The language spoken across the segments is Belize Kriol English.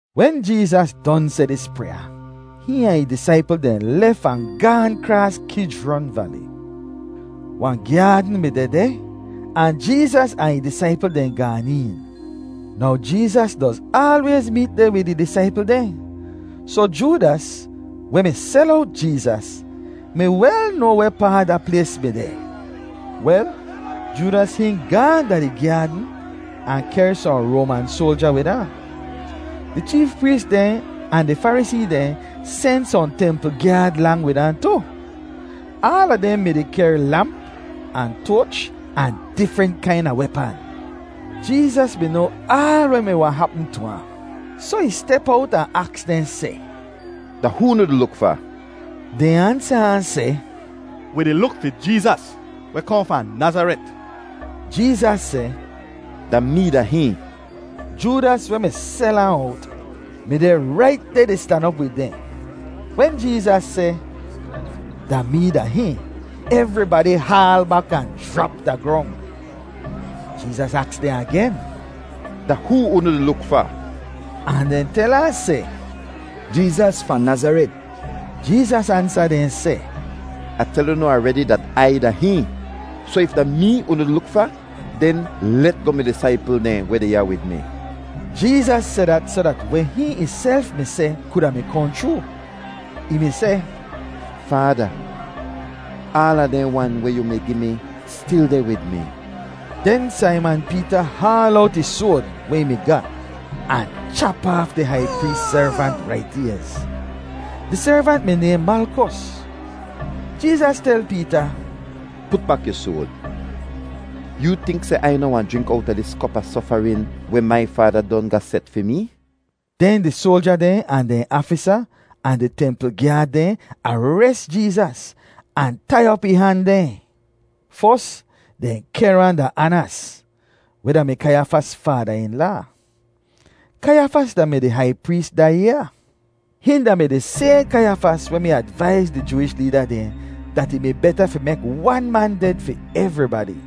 Wen Jeezas don seh dis pryaa, hihn ahn ih disaipl dehn lef ahn gaahn kraas Kijron Vali. Wahn gyaadn mi dehdeh ahn Jeezas ahn ih disaipl dehn gaan een. Now Jeezas doz aalwayz meet deh wid ih disaipl dehn, soh Joodas, weh mi sel owt Jeezas, mi wel noa wehpaa da plays mi deh. Wel, Joodas hihn gaahn da di gyaadn ahn kehr sohn Roaman soalja wid ahn. Di cheef prees dehn ahn di Farisee dehn sen sohn templ gyaad lang wid ahn tu. Aala dehn mi-di kehr lamp ahn toach ahn difrent kaina wepan. Jeezas mi noa aal weh mi wahn hapm tu ahn, soh ih step owt ahn aks dehn seh, “Da hoo unu di luk fa?” Dehn ansa ahn seh, “Wi di luk fi Jeezas, weh kohn fahn Nazaret.” Jeezas seh, “Da mee da hihn.” Joodas, weh mi sel ahn owt, mi deh rait deh di stan op wid dehn. Wen Jeezas seh, “Da mee da hihn,” evribadi haal bak ahn jrap da grong. Jeezas aks dehn agen, “Da hoo unu di luk fa?” Ahn dehn tel ahn seh, “Jeezas fahn Nazaret.” Jeezas ansa dehn seh, “Ah tel unu aredi dat Ai da hihn. Soh if da mee unu di luk fa, den let goh mi disaipl dehn weh deh ya wid mi.” Jeezas seh dat soh dat weh hihn ihself mi seh kuda mi kohn chroo. Ih mi seh, “Faada, aala dehn wan weh yu mi gi mi stil deh wid mi.” Den Saiman Peeta haal owt ih soad weh ih mi ga ahn chap aaf di hai prees servant rait ayz. Di servant mi nayhn Malkos. Jeezas tel Peeta, “Put bak yu soad. Yoo tink seh Ai noh wahn jrink owta dis kop a sofarin weh mai Faada don ga set fi mee?” Den di soalja dehn ahn dehn aafisa ahn di templ gyaad dehn ares Jeezas ahn tai op ih han dehn. Fos, dehn kehr ahn da Anas, weh da-mi Kaiyafas faada-in-laa. Kaiyafas da-mi di hai prees da yaa. Hihn da-mi di sayhn Kaiyafas weh mi advaiz di Jooish leeda dehn dat ih mi beta fi mek wan man ded fi evribadi.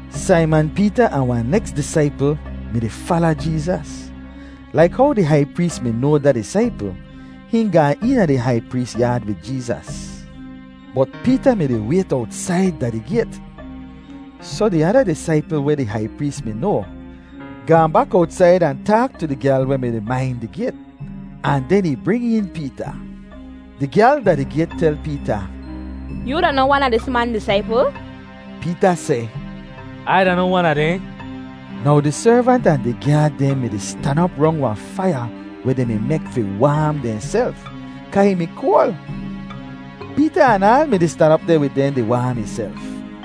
Saiman Peeta ahn wahn neks disaipl mi-di fala Jeezas. Laik how di hai prees mi noa da disaipl, hihn gaan eena di hai prees yaad wid Jeezas, bot Peeta mi-di wayt owtsaid da di gayt. Soh di ada disaipl weh di hai prees mi noa, gaahn bak owtsaid ahn taak tu di gyal weh mi-di main di gayt, ahn den ih bring een Peeta. Di gyal da di gayt tel Peeta, “Yoo da noh wan a dis man disaipl?” Peeta seh, “Ai da noh wan a dehn.” Now di servant ahn di gyaad dehn mi-di stan op rong wahn faiya weh dehn mi mek fi waam dehnself kaa ih mi koal. Peeta anaal mi-di stan op deh wid dehn di waam ihself.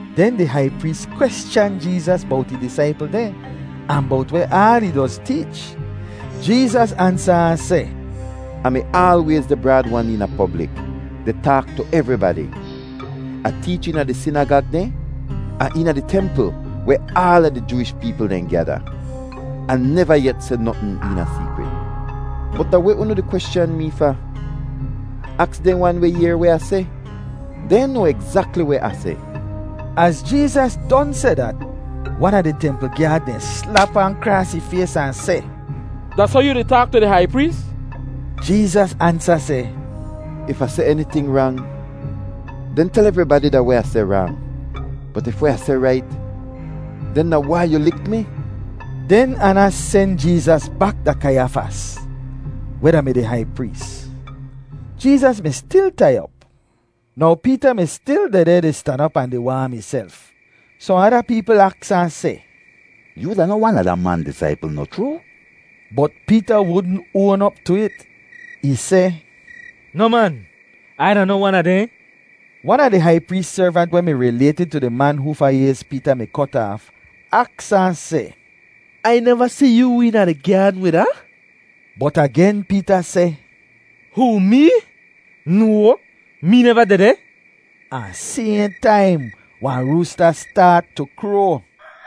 Den di hai prees kweschan Jeezas bowt ih disaipl dehn ahn bowt weh aal ih doz teech. Jeezas ansa ahn seh, “Ah mi aalwayz deh braad-wan eena poblik, di taak tu evribadi; Ah teech eena di sinagag dehn ahn eena di templ weh aala di Jooish peepl dehn gyada. Ah neva yet seh notn eena seekrit. Bot da weh unu di kweschan mee fa? Aks dehn wan weh yehr weh Ah seh. Dehn noa egzakli weh Ah seh.” Az Jeezas don seh dat, wan a di templ gyaad dehn slap ahn kraas ih fays ahn seh, “Da soh yoo di taak tu di hai prees?” Jeezas ansa seh, “If Ah seh eniting rang, den tel evribadi da weh Ah seh rang. Bot if weh Ah seh rait, den da wai yu lik mi?” Den Anas sen Jeezas bak da Kaiyafas, weh da-mi di hai prees. Jeezas mi stil tai op. Now Peeta mi stil dehdeh di stan op ahn di waam ihself. Sohn ada peepl aks ahn seh, “Yoo da noh wan a da man disaipl, noh chroo?” Bot Peeta wudn oan op tu it. Ih seh, “Noh man, Ai da noh wan a dehn.” Wan a di hai prees servant weh mi rilaytid tu di man hoofa ayz Peeta mi kot aaf, aks ahn seh, “Ai neva si yoo eena di gyaadn wid ahn?” Bot agen Peeta seh, “Hoo, Mee? No, mee neva dehdeh!” Ahn sayhn taim, wahn roosta staat tu kroa.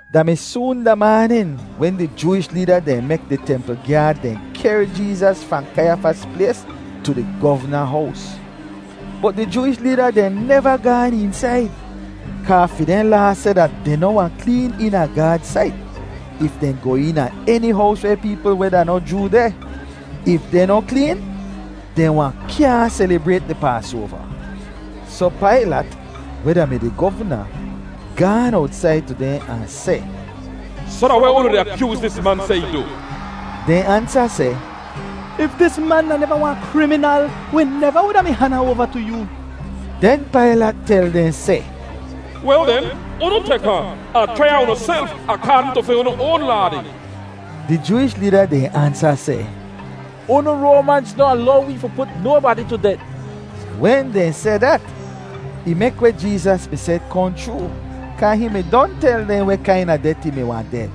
Da mi soon da maanin wen di Jooish leeda dehn mek di templ gyaad dehn kehr Jeezas fahn Kaiyafas plays tu di govna hows. Bot di Jooish leeda dehn neva gaan eensaid, kaa fi dehn Laa seh dat dehn noh wahn kleen eena Gaad sait if dehn goh eena eni hows weh peepl weh da noh Joo deh. If dehn noh kleen, dehn wahn kyaahn selibrayt di Paasoava. Soh Pailat, weh da-mi di govna, gaan owtsaid tu dehn ahn seh, “Soh da weh unu di akyooz dis man seh ih du?” Dehn ansa seh, “If dis man da neva wahn kriminal, wi neva wuda mi han ahn oava tu yoo.” Den Pailat tel dehn seh, “Wel den, unu tek ahn, ahn chrai ahn unuself akaadn tu fi unu oan laa dehn.” Di Jooish leeda dehn ansa seh, “Unu Roamanz noh alow wee fi put nobadi tu det.” (Wen dehn seh dat, ih mek weh Jeezas mi seh kohn chroo, kaa hihn mi don tel dehn weh kaina det ih mi wahn ded.)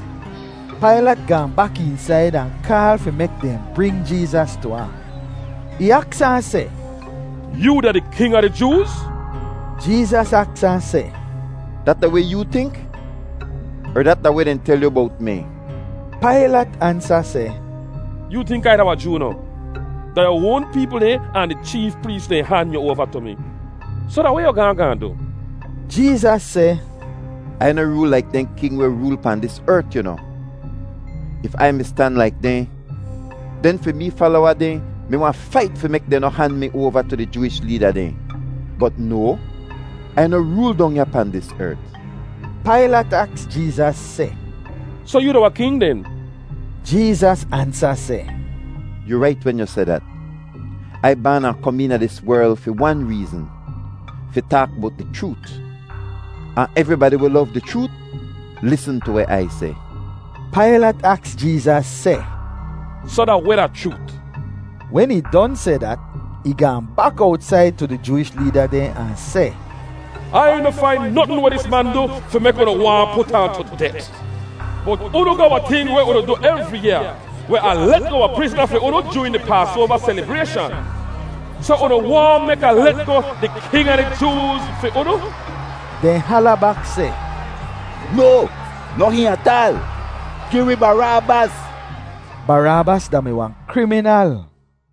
Pailat gaahn bak eensaid ahn kaal fi mek dehn bring Jeezas tu ahn. Ih aks ahn seh, “Yoo da di king a di Jooz?” Jeezas aks ahn seh, “Dat da weh yoo tink, er dat da weh dehn tel yu bowt mi?” Pailat ansa seh, “Yoo tink Ai da wahn Joo noh? Da yu oan peepl dehn ahn di cheef prees dehn han yu oava tu mi. Soh da weh yu gaahn gaahn du?” Jeezas seh, “Ai noh rool laik dehn king weh rool pahn dis ert, yu noh. If Ai mi stan laik dehn, den fi mee falowa dehn mi wahn fait fi mek dehn noh han mi oava tu di Jooish leeda dehn. Bot no, Ai noh rool dong ya pahn dis ert.” Pailat aks Jeezas seh, “Soh yoo da wahn king den?” Jeezas ansa seh, “Yu rait wen yu seh dat. Ai baan ahn kom eena dis werl fi wan reezn: fi taak bowt di chroot. Ahn evribadi weh lov di chroot lisn tu weh Ai seh.” Pailat aks Jeezas seh, “Soh da weh da chroot?” Wen ih don seh dat, ih gaahn bak owtsaid tu di Jooish leeda dehn ahn seh, “Ai noh fain notn weh dis man du fi mek unu waahn put ahn tu det. Bot unu ga wahn ting weh unu du evri yaa, weh Ah let goh wahn prizna fi unu joorin di Paasoava selibrayshan. Soh unu waahn mek Ah let goh ‘di king a di Jooz’ fi unu?” Dehn hala bak seh, “No, noh hihn ataal! Gi wi Baraabas!” (Baraabas da-mi wahn kriminal.)